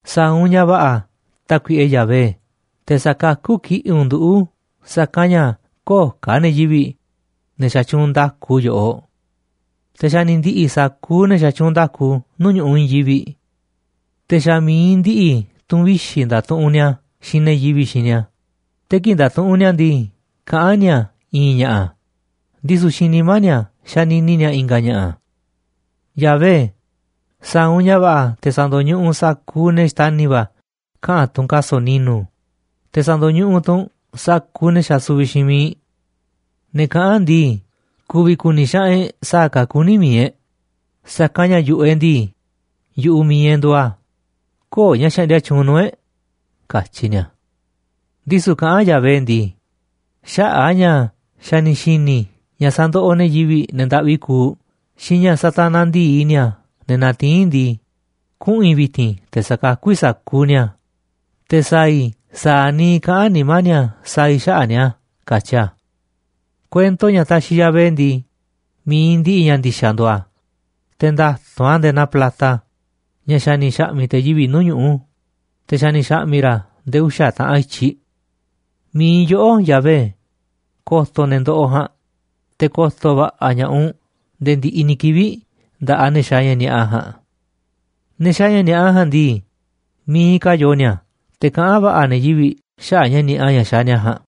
Sa̱a̱ u̱nꞌ ña̱ va̱ꞌa̱, Tákuiꞌe Yahvé, te̱ sa̱kakú kiꞌi̱ꞌ u̱nꞌ nduꞌu̱, sa̱kanꞌ ña̱ köo̱ꞌ ka̱ ne̱ yivi̱ꞌ, ne̱ xatyuunꞌ nda̱ku yoꞌoꞌ, te̱ xa̱ ni̱ ndi̱ꞌi̱ sa̱kuuꞌ ne̱ xatyuunꞌ nda̱ku nuu̱ꞌ ñu̱ꞌuꞌ i̱i̱n yivi̱ꞌ. Te̱ xa̱ miiꞌ ndiꞌiꞌ tu̱n vixi̱ ndatuꞌunꞌ ni̱a̱ xiinꞌ ne̱ yivi̱ꞌ xiinꞌ ni̱a̱. Te̱ kii̱ꞌ ndatuꞌunꞌ ni̱a̱ ndii, kaꞌán ni̱a̱ i̱i̱n ña̱ꞌa̱, ndisu̱ xiinꞌ nimá ni̱a̱ xanini ni̱a̱ i̱nga̱ ña̱ꞌa̱. Yahvé, sa̱a̱ u̱nꞌ ña̱ va̱ꞌa̱ te̱ sa̱ndo̱ñuꞌuꞌ u̱nꞌ sa̱kuuꞌ ne̱ xtani̱ va̱ kaꞌa̱n tu̱n kaso̱ꞌ ni̱nu̱, te̱ sa̱ndo̱ñuꞌuꞌ tu̱ u̱nꞌ sa̱kuuꞌ ne̱ xasuviꞌ xiinꞌ miiꞌ. Ne̱ kaꞌán ndii: “Ku̱vi̱ ku̱ni̱ xaꞌanꞌ e̱ꞌ sa̱a̱ ka̱ kuní mi̱iꞌ e̱ꞌ, sa̱kanꞌ ña̱ yu̱ꞌuꞌ e̱ꞌ ndii, yu̱ꞌuꞌ mi̱iꞌ e̱ꞌ nduuꞌ a̱, köo̱ꞌ ña̱ xaꞌndia tyuunꞌ nuu̱ꞌ e̱ꞌ”, katyi ni̱a̱. Ndisu̱ kaꞌán Yahvé ndii: “Xaꞌa̱ꞌ a̱ ña̱ xa̱ ni̱ xi̱ni̱ i̱ ña̱ sandoꞌoꞌ ne̱ yivi̱ꞌ, ne̱ ndaꞌvi kuuꞌ, xiinꞌ ña̱ satanaꞌ ndi̱i ni̱a̱ ne̱ natiín ndii, kuꞌu̱n i̱ vi̱ti̱n te̱ sa̱kakú i̱ sa̱kuuꞌ ni̱a̱, te̱ sa̱a̱ i̱ sa̱a̱ niiꞌ kaꞌán nimá ni̱a̱ sa̱a̱ i̱ xaꞌa̱ꞌ ni̱a̱” katyi a̱. Kuento ña̱ taxiꞌ Yahvé ndii, mi̱iꞌ ndiꞌiꞌ ña̱ ndi̱xa̱ nduuꞌ a̱, te̱ nda̱tu̱nꞌ a̱ nde̱e̱ naa plata, ña̱ xa̱ ni̱ xa̱ꞌmi̱ꞌ te̱ yivi̱ꞌ nuu̱ꞌ ñuꞌu̱, te̱ xa̱ ni̱ xa̱ꞌmi̱ ra̱ a̱ nde̱e̱ uxa̱ taꞌanꞌ i̱tyiꞌ. Mi̱iꞌ yoꞌó, Yahvé, ko̱to̱ ne̱ ndoꞌoꞌ ja̱a̱nꞌ, te̱ ko̱to̱ va̱ꞌa̱ ña̱ꞌaꞌ u̱nꞌ nde̱e̱ ndiꞌiꞌ ni̱ kivi̱ꞌ nda̱ꞌaꞌ ne̱ xaaꞌ ña̱ ni̱a̱ꞌa ja̱a̱nꞌ. Ne̱ xaaꞌ ña̱ ni̱a̱ꞌa ja̱a̱nꞌ ndii, miiꞌ ka̱ te̱ yoo ni̱a̱, te̱ kaꞌán va̱ꞌa̱ ne̱ yivi̱ꞌ xaꞌa̱ꞌ ña̱ ni̱a̱ꞌa ña̱ xaaꞌ ni̱a̱ ja̱a̱nꞌ.